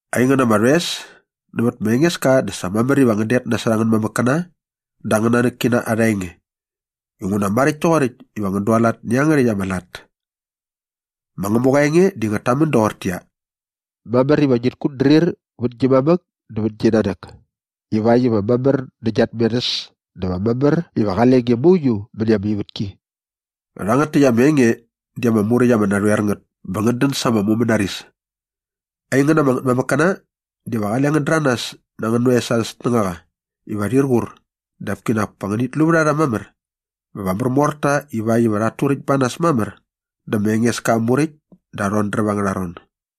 Aingän ama rhoes, nävät ma Engeska dä sa mamär iva ngän det nasot angän mamäkkäna dä angän nanäkkina arha enge inguna maräkt toqoräkt iva ngän dualat nä iangärhäkt ama lat. Ma Ngämuqa aa enge di ngät tamän doqortäqyia, “Mamär iva ngit kutdrir vät gi mamäk dä vät gi nanäk” “ivakt iva mamär nä gia tmerhäs dä va mamär iva qale nge mauiu mäni ama ivätki.” Rhangät täkt ama enge di ama muräkt ama narhoer ngät bä ngät dän sa ama mumänaris. Aingän ama ngätmamäkkäna, diva qale ngän däranas na angän oes arhä snängaqa iva rhir qur dap kinak pa ngänit lu vät a rha mamär bä va märmor ta ivakt iva rhat turäkt ba nas mamär dä ma Engeska aa muräkt dä aa rhodräp angärha ron.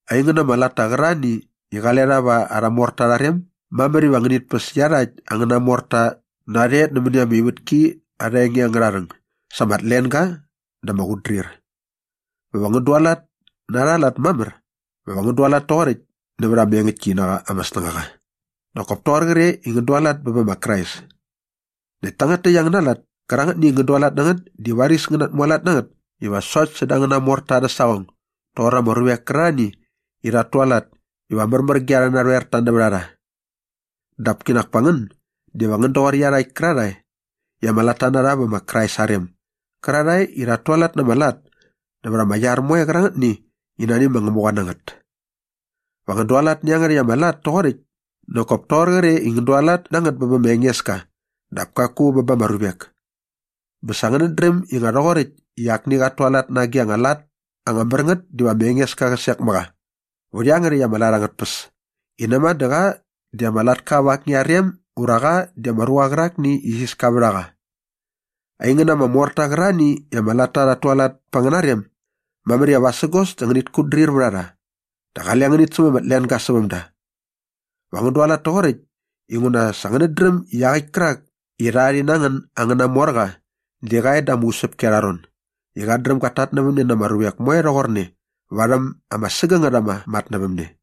Aingän ama latta qärarhani i qale rha va arha morta arha rem, mamär iva ngänit päs iarhakt angäna morta narhe nämäni ama ivätki arha enge angärha rhäng sa ama tlenga dä ama qutdrir. Bä va ngän dualat na arha lat mamär dä va ngän dualat toqoräkt nävät ama engäktki na qa ama snängaqa nak kop toqor qre i ngän dualat bä bä ma Krais. Näkt tangät täkt angäna lat kärangätni i ngän dualat na ngät di varis ngän natmualat na ngät iva sokt säda angäna morta arhä saqong doqor ama ruvek kärarhani i rhat tualat iva märmär ge arhä narhoerta nävät a rha. Dap kinak pa ngän diva ngän doqor iarhakt kärarhae i ama latta na rha vä ma Krais aa rem gärarhae i rhat tualat na ama lat nävät arha iar moe qärangätni i nani ma Ngämuqa na ngät. Va ngän dualat nä iangärhäkt ama lat toqoräkt nak kop toqor qre i ngän dualat na ngät bä bä ma Engeska dap kaku bä ba ama ruvek. Bä sa ngänät dräm i nga rhoqoräkt i akni qat tualat na agi a lat ama mär ngät diva ma Engeska qä sek mä qa vät iangärhäkt ama lat angät tpäs i näma dä qa di ama latka va akni aa rem ura qa di ama ruqa qärakni i isiska vät a qa. Aingän ama morta qärarhani i ama latta rhat tualat pa angäna rem, mamär iva qosaqi ngänit kutdrir vät a rha dä qale ngänit säm ama tlenga säväm da. Va ngän dualat toqoräkt inguna sa ngänät dräm i iaqäkt kärak i rha rhi na ngän angäna morqa di qa e da ama usäpki arha ron i qat dräm gat tatnävämne na ama ruvek moe rhoqorne varhäm ama sägängät ama matnävämne.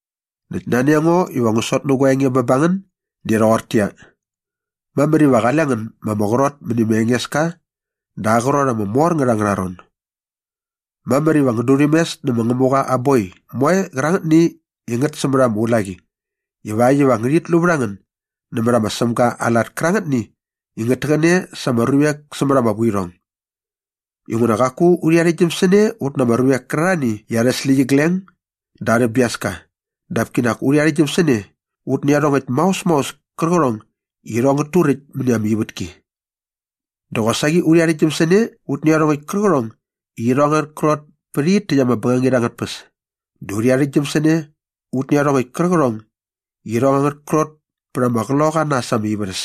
Näkt nani a ngo iva ngu sot nä gua enge bä ba ngän di rhoqortäqyia, mamär iva qale ngän ma ama qrot mäni ma Engeska da aa qrot ama mor ngät angärha ron. Mamär iva ngän durhämes nä ma Ngämuqa aa boi moe qärangätni i ngät sämät ama ulaqi ivakt iva ngärhit lu vät a ngän nämät ma Sämga aa lat kärangätni i ngät täqäne sa ama ruvek sämät ama vuirhong. Inguna qaku urhi arhäktgyäm sä ne ut na ama ruvek kärarhani i arhä släqyigleng dä arhä biaska dap kinak urhi arhäktgyäm sä ne ut nä iarhongäkt maos maos kärqärhong i irhong ngät turäkt mäni ama ivätki. Dä qosaqi urhi arhäktgyäm sä ne ut nä iarhongäkt kärqärhong i irhong angät krot pä rhit täkt ama bängangit angät tpäs dä urhi arhäktgyäm sä ne ut nä iarhongäkt kärqärhong i irhong angät krot pät ama qloqaqa na äs ama ivärhäs.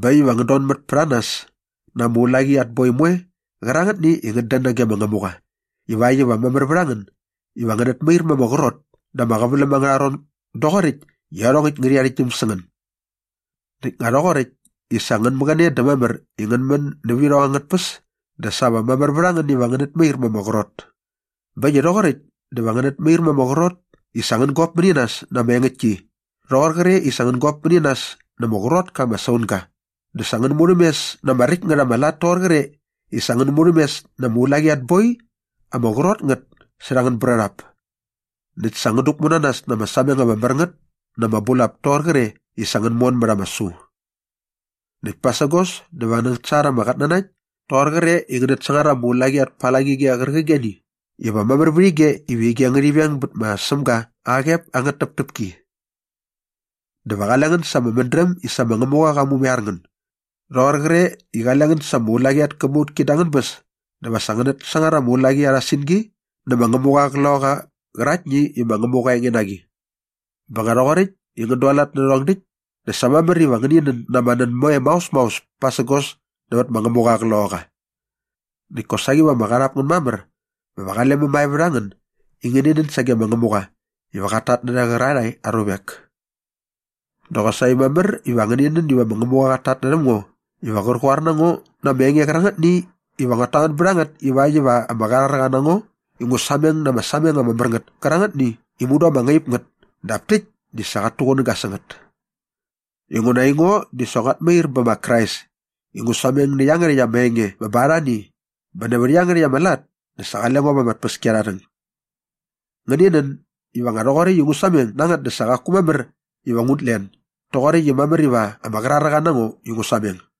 Bä äkt iva ngän donmät pät a nas na ama ulaqi at boi moe qärangätni i ngät dän nage ma Ngämuqa ivakt iva mamär vät a ngän iva ngänät mair ma ama qrot da ama qäväläm angärha ron doqoräkt i iarhongäkt ngärhi arhäktgyäm sä ngän. Näkt nga rhoqoräkt i sa ngän mäqäne dä mamär i ngän män nävä irhong angät tpäs dä sa va mamär vät a ngän iva ngänät mair ma ama qrot. Bä äkt i rhoqoräkt dä va ngänät mair ma ama qrot i sa ngän gop mäni nas na ama engäktki rhoqor qre i sa ngän gop mäni nas na ama qrot ka ama saunga dä sa ngän murhämes na ama räkt ngät ama lat toqor qre i sa ngän murhämes na ama ulaqi at boi ama qrot ngät särha angän brärhap näkt sa ngän däkmu nas na ama sameng ama mär ngät na ama bulap toqor qre i sa ngän mon mät ama su. Näkt pasägos dä va ngänät sangar ama qatnanakt toqor qre i ngänät sangar ama ulaqi at palangige qärqigeni iva mamär vät ige iva ige ngärhi veng bät ma Sämga aa qep angät täptäpki. Dä va qale ngän sa ama mädräm i sa ma Ngämuqa qa mumaiar ngän doqor qre i qale ngän sa ama ulaqi at käbautki da angän bäs dä va ngänät sangar ama ulaqi arha singi nä ma Ngämuqa aa Qloqaqa qärangätni i ma Ngämuqa aa enge na qi. Bä nga rhoqoräkt i ngän dualat nä rhärhong däkt dä sa mamär iva ngäni nän na ama nän moe maos maos pasägos nävät ma Ngämuqa aa Qloqaqa. Näkt kosaqi va ama qarhap ngän mamär bä va qale mämae vät a ngän i ngäni nän sage ma Ngämuqa iva qat tatnärhä qärarhae aa ruvek. Dä qosaqi mamär iva ngäni nän iva ma Ngämuqa qat tatnärhäm ngo iva qär qoar na ngo na ama enge qärangätni iva nguat tamän bät a ngät ivakt iva ama qraräqa na ngo i ngu sameng na ama sameng ama mär ngät kärangätni i mudu ama ngaip ngät dap täkt di sa qat tuqunäga sä ngät. Inguna aingo di sa nguat mair bä ma Krais i ngu sameng nä iangärhäkt ama enge bä bä arhani bä nävät iangärhäkt ama lat dä sa qale ngo va ama tpäskiarharhäng. Ngäni nän iva nga rhoqoräkt i ngu sameng na ngät dä sa qaku mamär iva ngut len doqoräkt i mamär iva ama qraräqa na ngo i ngu sameng.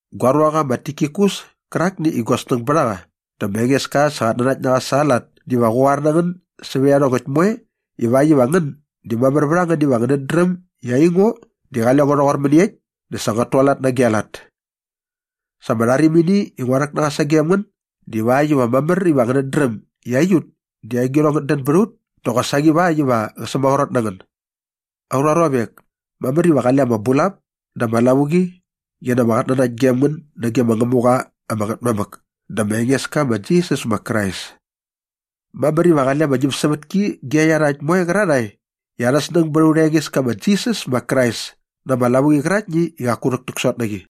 Gua ruaqa ma Tikikus kärakni i gua snäng bät a qa dä ma Engeska sa qat nanakt na qa sa aa lat diva qä qoar na ngän sävät iarhongäkt moe ivakt iva ngän di mamär vät a ngän iva ngänät dräm i aingo di qale ngo rhoqor mäniekt dä sa nguat tualat na agi a lat. Sa ama rharimini i ngua rhäk na qa sagem ngän divakt iva mamär iva ngänät dräm i aiut di agirhong ngät dän bät a ut dä qosaqi ivakt iva qät sämaqrot na ngän. Aurha ruavek, mamär iva qale ama bulap dä ama lavuqi qi na ama qatnanakt gem ngän nage ma Ngämuqa ama Ngätmamäk dä ma Engeska ma Jisas ma Krais. Mamär iva qale ama ñämsävätki ge iarhakt moe qärarhae i arha snäng bät aurha Engeska ma Jisas ma Krais na ama lavuqi qäraktni i qaku rhäktäksot na qi.